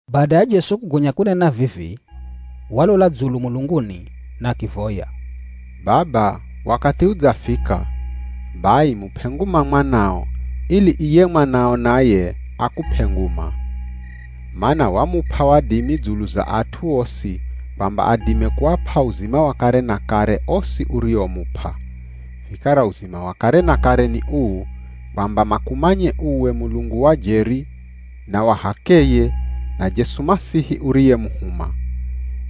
Bada ya Jesu kugonya kunena vivi, walola dzulu mulunguni na akivoya, “Baba wakathi udzafika. Bai mup'e nguma Mwanao, ili iye Mwanao naye akup'e nguma. Mana wamup'a wadimi dzulu za at'u osi kwamba adime kuap'a uzima wa kare na kare osi uriomup'a. Vikara uzima wa kare na kare ni uu, kwamba makumanye uwe Mulungu wa jeri na wa h'akeye na Jesu Masihi uriyemuhuma.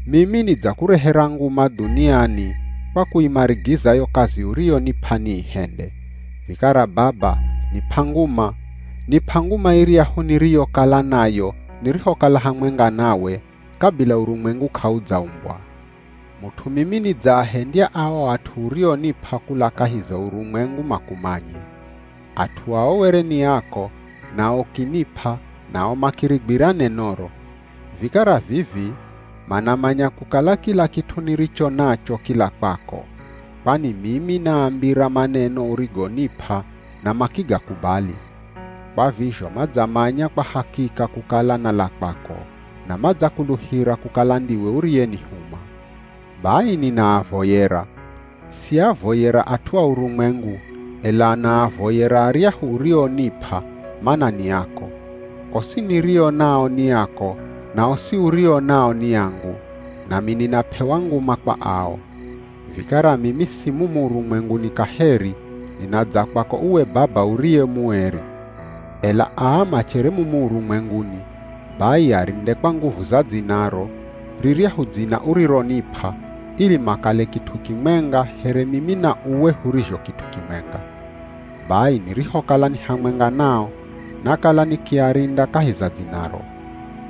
Mimi nidzakurehera nguma dhuniani kwa kuimarigiza yo kazi uriyonip'a niihende. Vikara Baba, nip'a nguma, nip'a nguma iryahu niriyokala nayo nirihokala hamwenga nawe kabila urumwengu k'audzaumbwa.” “Mut'u mimi nidzaahendya ao at'u urionip'a kula kahi za urumwengu makumanye. At'u ao were ni ako nao ukinip'a nao makirigwira nenoro. Vikara vivi manamanya kukala kila kit'u niricho nacho kila kwako, kwani mimi naambira maneno urigonip'a na makigakubali. Kwa vizho madzamanya kwa hakika kukala nala kwako, na madzakuluhira kukala ndiwe uriyenihuma. “Bai ninaavoyera. Siavoyera at'u a urumwengu, ela naavoyera aryahu urionip'a, mana ni ako. Osi nirio nao ni ako na osi urio nao ni angu, nami ninap'ewa nguma kwa ao. Vikara mimi si mumu urumwenguni kaheri, ninadza kwako uwe Baba uriye mueri. Ela aa machere mumu urumwenguni, bai arinde kwa nguvu za dzinaro, riryahu dzina urironip'a, ili makale kit'u kimwenga here mimi na uwe hurizho kit'u kimwenga. Bai nirihokala ni hamwenga nao nakala nikiarinda kahi za dzinaro.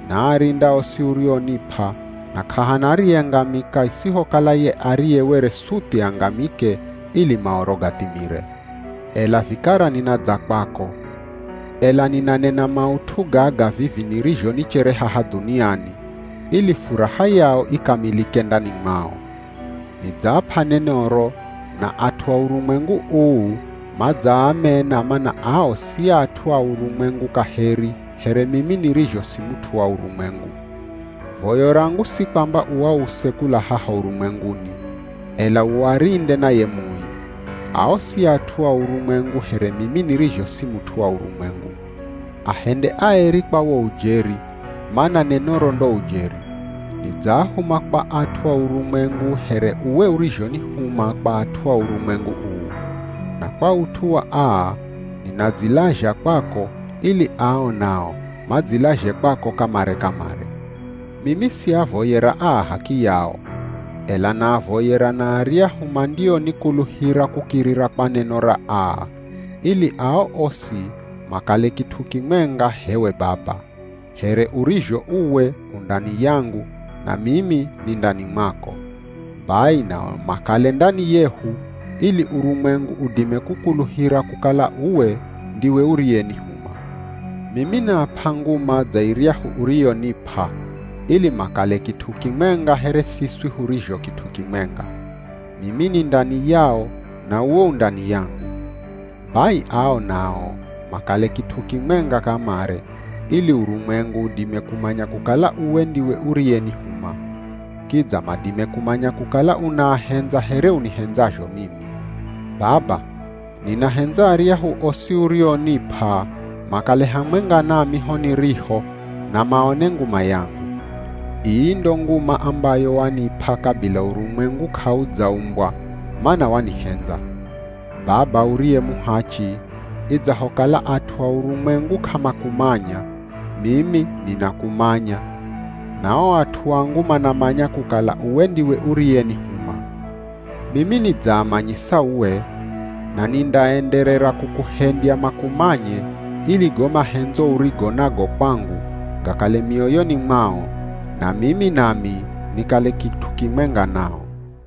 Naarinda osi urionip'a na k'ahana ariyengamika isihokala ye ariye were suthi angamike ili Maoro gathimire. Ela vikara ninadza kwako, ela ninanena maut'u gaga vivi nirizho nichere haha dhuniani, ili furaha yao ikamilike ndani mwao. Nidzaap'a nenoro, na at'u a urumwengu uu, madzaamena mana ao si at'u a urumwengu kaheri here mimi nirizho si mut'u wa urumwengu. Voyo rangu si kwamba uause kula haha urumwenguni, ela uarinde na ye Mui. Ao si at'u a urumwengu here mimi nirizho si mut'u wa urumwengu. Ahende aeri kwa wo ujeri, mana nenoro ndo ujeri. Nidzaahuma kwa at'u a urumwengu here uwe urizhonihuma kwa at'u a urumwengu uu. Na kwa ut'u wa aa ninadzilazha kwako ili ao nao madzilazhe kwako kamare-kamare.” “Mimi siavoyera aa h'akiyao, ela naavoyera na aryahu mandionikuluhira kukirira kwa neno ra aa, ili ao osi makale kit'u kimwenga h'ewe Baba, here urizho uwe u ndani yangu na mimi ni ndani mwako. Bai nao makale ndani yehu ili urumwengu udime kukuluhira kukala uwe ndiwe uriyenihuma. Mimi naap'a nguma dza iryahu uriyonip'a, ili makale kit'u kimwenga here siswi hurizho kit'u kimwenga. Mimi ni ndani yao na uwe u ndani yangu. Bai ao nao makale kit'u kimwenga kamare, ili urumwengu udime kumanya kukala uwe ndiwe uriyenihuma. Kidza madime kumanya kukala unaahendza here unihendzazho mimi. “Baba, ninahendza aryahu osi urionip'a makale hamwenga nami ho niriho na maone nguma yangu. Ii ndo nguma ambayo wanip'a kabila urumwengu k'audzaumbwa, mana wanihendza. Baba uriye muhachi, idzahokala at'u a urumwengu k'amakumanya, mimi ninakumanya na o at'u angu manamanya kukala uwe ndiwe uriyenihuma. Mimi nidzaamanyisa uwe, na nindaenderera kukuhendya makumanye ili go mahendzo urigo nago kwangu, gakale mioyoni mwao, na mimi nami nikale kit'u kimwenga nao.”